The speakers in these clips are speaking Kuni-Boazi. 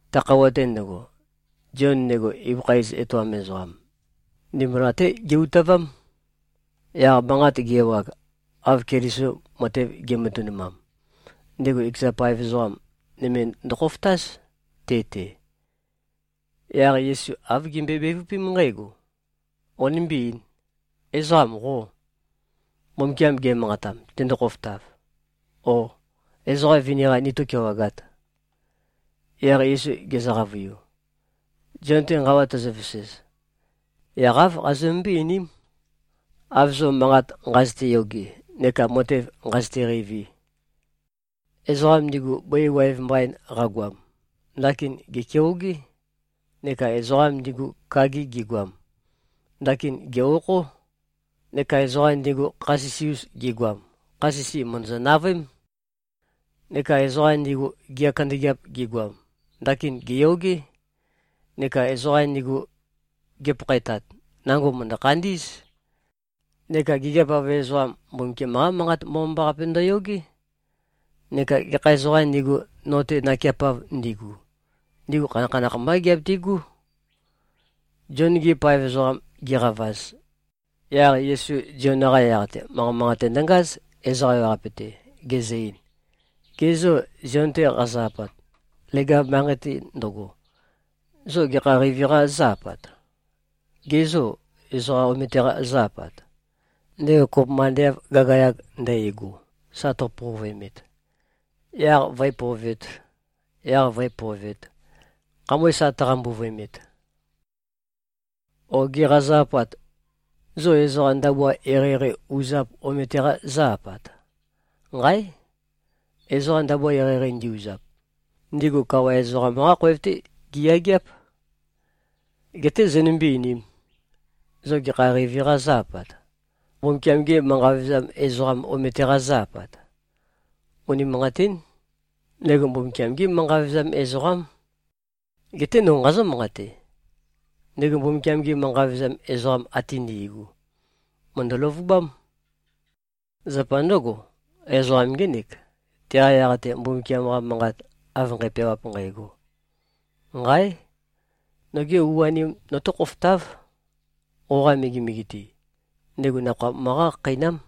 Ta khøuwa-te ndøgo, Zion, ndego ibøkha iz etoam ezoqam, ndimbula-té ge-utavám. Yaq manqat ge-ewag, av Keliso matev ge꞉matønumam, ndego ekeza paev ezoqa nøme ndokhofotáz, te-te. Yaq Yesu āv gimbøe-bevøpém nqǽgo, “Qonimbí-eīn. Ezoqam qô, Mbumbukiam ge꞉manqatam, tendo-khofotav? Ó, ezoqa vini-qa nitó-kewagāt?” Yaq Yesu gezø-qavøiu, “Zion-te nqawa tozovesez, yaq āv qazømømbøé-einím, av zo manqat nqazøte-yoge neka matev nqazøte-qeivi. Ezoqam ndigu bøi waev mbain qagoam, ndakin gèkeogé. Neka ezoqam ndigu kagi gigoam, ndakin gè-okhó. Neka ezoqa ndigu kha sisi-us gigoam, kha sisi mø̀ndøzø-navøém. Neka ezoqa ndigu gea kandøgeap gigoam, ndakin gèyogé. Neka ezoqa ndigu gipakhaetat, nango mø̀ndø-khandí꞉z. Neka gigiap-av ezoqam, Mbumbukiam-qá Manqat Mbomambaqape ndøyogé. Neka gekha ezoqām ndigu, no-te nakeapav ndigu, ndigu khanakhanakh mbá giabitigú.” Zion-gi paev ezoqam gi꞉qavaz, yaq Yesu Zion-qa yaq-te manqa manqate ndøngáz, ezoqa ewaqape-te, gezø-ein, “Gê, zo Zion-te qazo-apat, leg-av manqei-te ndøgo, zo gekha qeivi-qa zó-apat? Gê, zo ezoqa omete-qa zó-apat, ndego kopømba ande av gagayag ndægo, sa tøpovøemet, yaq vǿepovēt, yaq vǿepovēt, khamøe sa tøqambuvøemet? O gê, qazo-apat, zo ezoqa ndabua eqeieqei uzap omete-qa zó-apat? Nqáe! Ezoqa ndabua eqeieqei ndi-uzap, ndigu kawa ezoqam-qá khoev-té giyageáp. Geté zonømbé-einīm. Zo gekha qeivi-qa zó-apat? Mbumbukiam-gê manqa vevezam ezoqam omete-qa zó-apat? Unimanqatín. Ndego Mbumbukiam-gé manqa vevezam ezoqám. Geté no nqazǿ-manqate. Ndego Mbumbukiam-gi manqa vevezam ezoqam ate ndi꞉gu, mø̀ndø-løvubám. Zapa ndǿgo, ezoqam ngének, teqa yaq-te Mbumbukiam-qa Manqat av nqæpeawap nqægo, ‘Nqáe! Noge u-anem notó-khofotáv, qoqa megemege-te. Ndego nakhoa møqá-khakheinám.’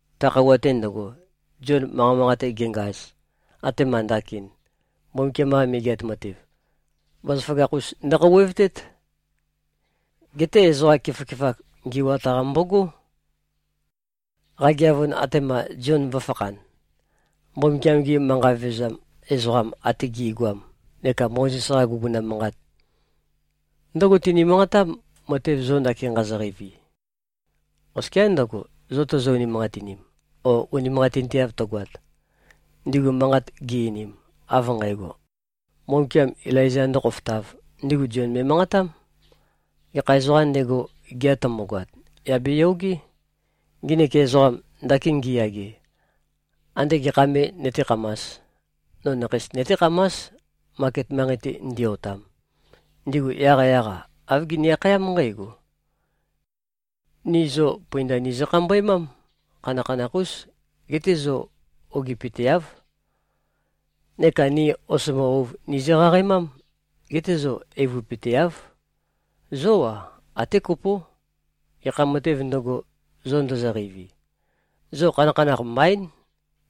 Ta khøuwa-te ndøgo, Zion manqa manqate ge꞉ngaz, atema ndakin, Mbumbukiam-qa Megeat Matev, bazaføgakh-us ndøkhouwevtét. Geté ezoqa keføkefak ngi꞉wat-qa mbógo. Qageavun, atema꞉ Zion vø̄fakhan, Mbumbukiam-gi manqa vevezam ezoqam ate gi꞉goam neka Mozes-qa guguna manqat, ndǿgo tini-manqatám, matev zo ndakin nqazo-qeivi. Oskiá ndøgo, zo tozo-unimanqatinim o unimanqatinteav tøgoat: Ndigu manqat gi-einim, av nqægo, Mbumbukiam Ilaiza ndōkhofotāv, ndigu Zion me꞉manqatám. Gekha ezoqām ndego, gea tømbogoat, yà beyogé. Nginik ezoqam, ndakin ngiyage, andé gekha me nøtékhamās? No nakheis nøtékhamás, maket manqei-te ndi-otam. Ndigu yaqyaq-a, āv gini-akhayám nqǽgo, ‘Ni zo pøinda nizø-khambøemám. Khanakhanakh-ús. Geté zo ogipøteáv. Neka ni osombo ouv nizø-qaqaemám. Geté zo eivøpøteáv.’ Zó-a, até kopó. Gekha matēv ndøgo, zo ndozoqeivi, zo khanakhanakh mbaín.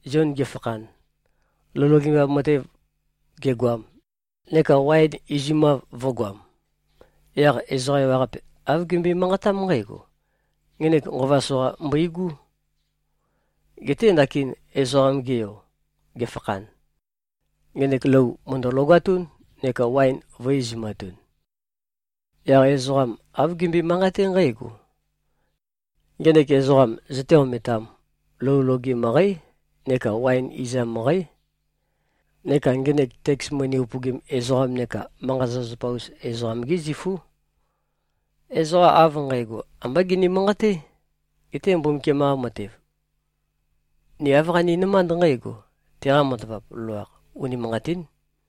Zion gefakhan, lou logemav matev gegoam, neka waen izumav vø̄goam, yaq ezoqa ewaqape āv gimbøe-manqatám nqǽgo, ‘Ngenek nqova soqa mbøigú!’ Geté ndakin Ezoqam-ge Yo gefakhan, ngenek lou mø̀ndø-logatún, neka waen vø̄-izumatun. Yaq ezoqam āv gimbøe-manqaté nqǽgo, ‘Ngenek ezoqam zøté-ometām. Lou loge møqǽ, neka waen izam møqǽ. Neka ngenek teks moni upøgim ezoqam neka manqa-zapazapa-us ezoqam-gí zifú.’ Ezoqa av nqægo ambá gini-manqaté. Geté Mbumbukiam-qa matev, ni āv qaninømánd nqǽgo, teqa matavap loloakh, unimanqatín.”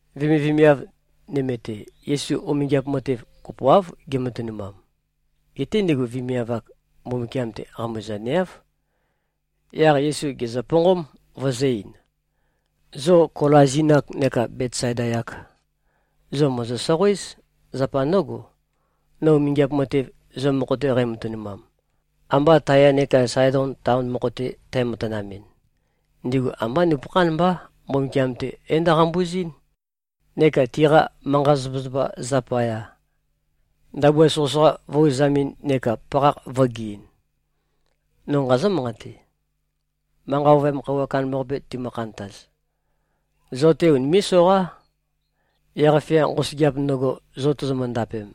Vemivemiav nøme-te, Yesu umingiap matev kopoáv gematønumam. Geté ndigu vemiav-ak, Mbumbukiam-te qambuzaneáv. Yaq Yesu gèzøponqóm, vøzø̄-ein, “Zo Kolazin-ak neka Betsaida-yak, zo mòzo-soqoéz. Zapa ndǿgo, no umingiap matev, zo mokho-te qæmatønumam, ambā Taya neka Saedon taon mokho-te tæmatanamɨn, ndigu ambá nupøkhán mbá, Mbumbukiam-te é-ndo꞉qambuzɨ́n, neka tiqa manqa-zapazapa zapaya, ndabua soqøsoqa vø̄-uzamɨn neka pakhakh vø̄geɨn. No nqazǿ-manqate: Manqa ovøyam khøuwa kandambaqape timø-khantaz, zo-te unimé꞉-soqá. Yaq-fia nqosøgeap ndøgo, zo tozomø-ndapem,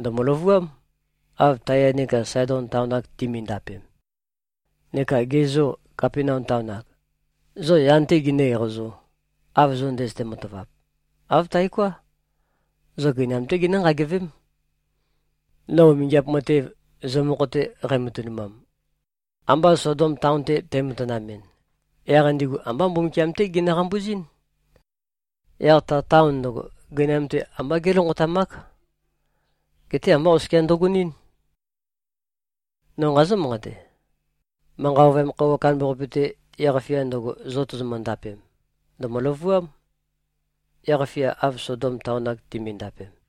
ndø̀mø-løvuám, av Taya neka Saedon taon-ak timindapem. Neka ge zô, Kapenaum taon-ak? Zo, yan-té ginǿ-eqazō, av zo ndøzøte-matavap? Āv taoká. Zo gøinam-té ginǿ-nqagevém. No umingiap matev, zo mokho-te qæmatønumam, ambā Sodom taon-te tæmatanamɨn, yaq ndigu ambá Mbumbukiam-té ginø-qambuzín. Yaq ta taon ndøgo, gøinam-te ambá gélonqotamák. Geté ambá oskia ndøgonɨ́n. No nqazǿ-manqate: Manqa ovøyam khøuwa kandambaqape-te, yaq-fia ndøgo, zo tozomø-ndapem, ndø̀mø-løvuám, yaq-fia, av Sodom taon-ak timindapem.”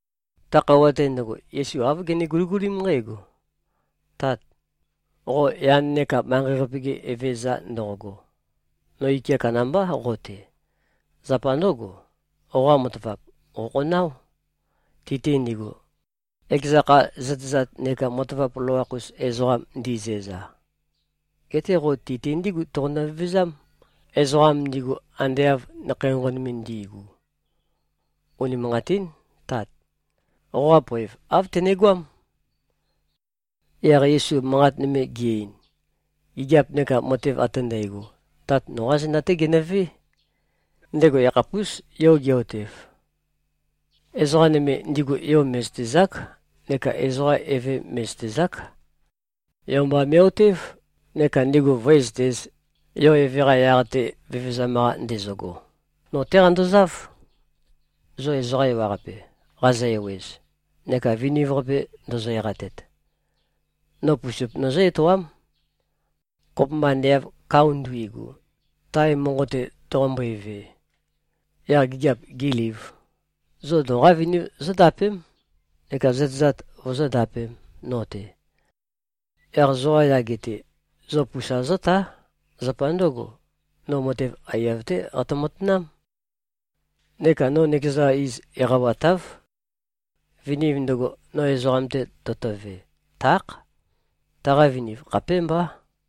Ta khøuwa-te ndøgo, Yesu āv gene-guligulím nqǽgo, “Tat, qo yan neka manqei-qape-ge Evezøza ndoqogo. No ike kandambá qo-te. Zapa ndǿgo, qoqa matavap qòkhonáo, ti-te ndigu, ekeza kha zøtezat neka matavap loloakh-us ezoqam ndizæza. Geté qo ti-te ndígu toqonø-vevezám, ezoqam ndigu ande av nakhei nqonqon ndi꞉gu. Unimanqatín. Tat. Qoqā poev, āv tønegoám.” Yaq Yesu manqat nøme ge-ein, “Gigiap neka matev ate ndægo, Tat noqá zenda-té genøvé. Ndego yakhapús, Yo ge꞉-otev. Ezoqa nøme, ndigu Yo mè꞉zøtezák. Neka ezoqa Eve mè꞉zøtezák. Yo mba me꞉-otév, neka ndigu vǿezøtēz, Yo Eve-qa yaq-te vevezam-qa ndezøgo.” “No-té qandozáv, zo ezoqa ewaqape, qazø-ewez neka viniv-qape ndozo-eqatet. No pusup nøzǿ-etoám. Kopømba ande av kao nduigu, tae monqo-te toqombøe-ve, yaq gigiap gēlīv, zo noqá viniv zóndapém, neka zøtezat vozóndapēm, no-te. Yaq zoqa yage-te, zo pusa zótá. Zapa ndǿgo, no matev aiyav-té qatø-matanám. Neka no nøkeza iz eqawatáv. Viniv ndøgo, no ezoqam-te totove, tákh. Taqa viniv khapémbá.”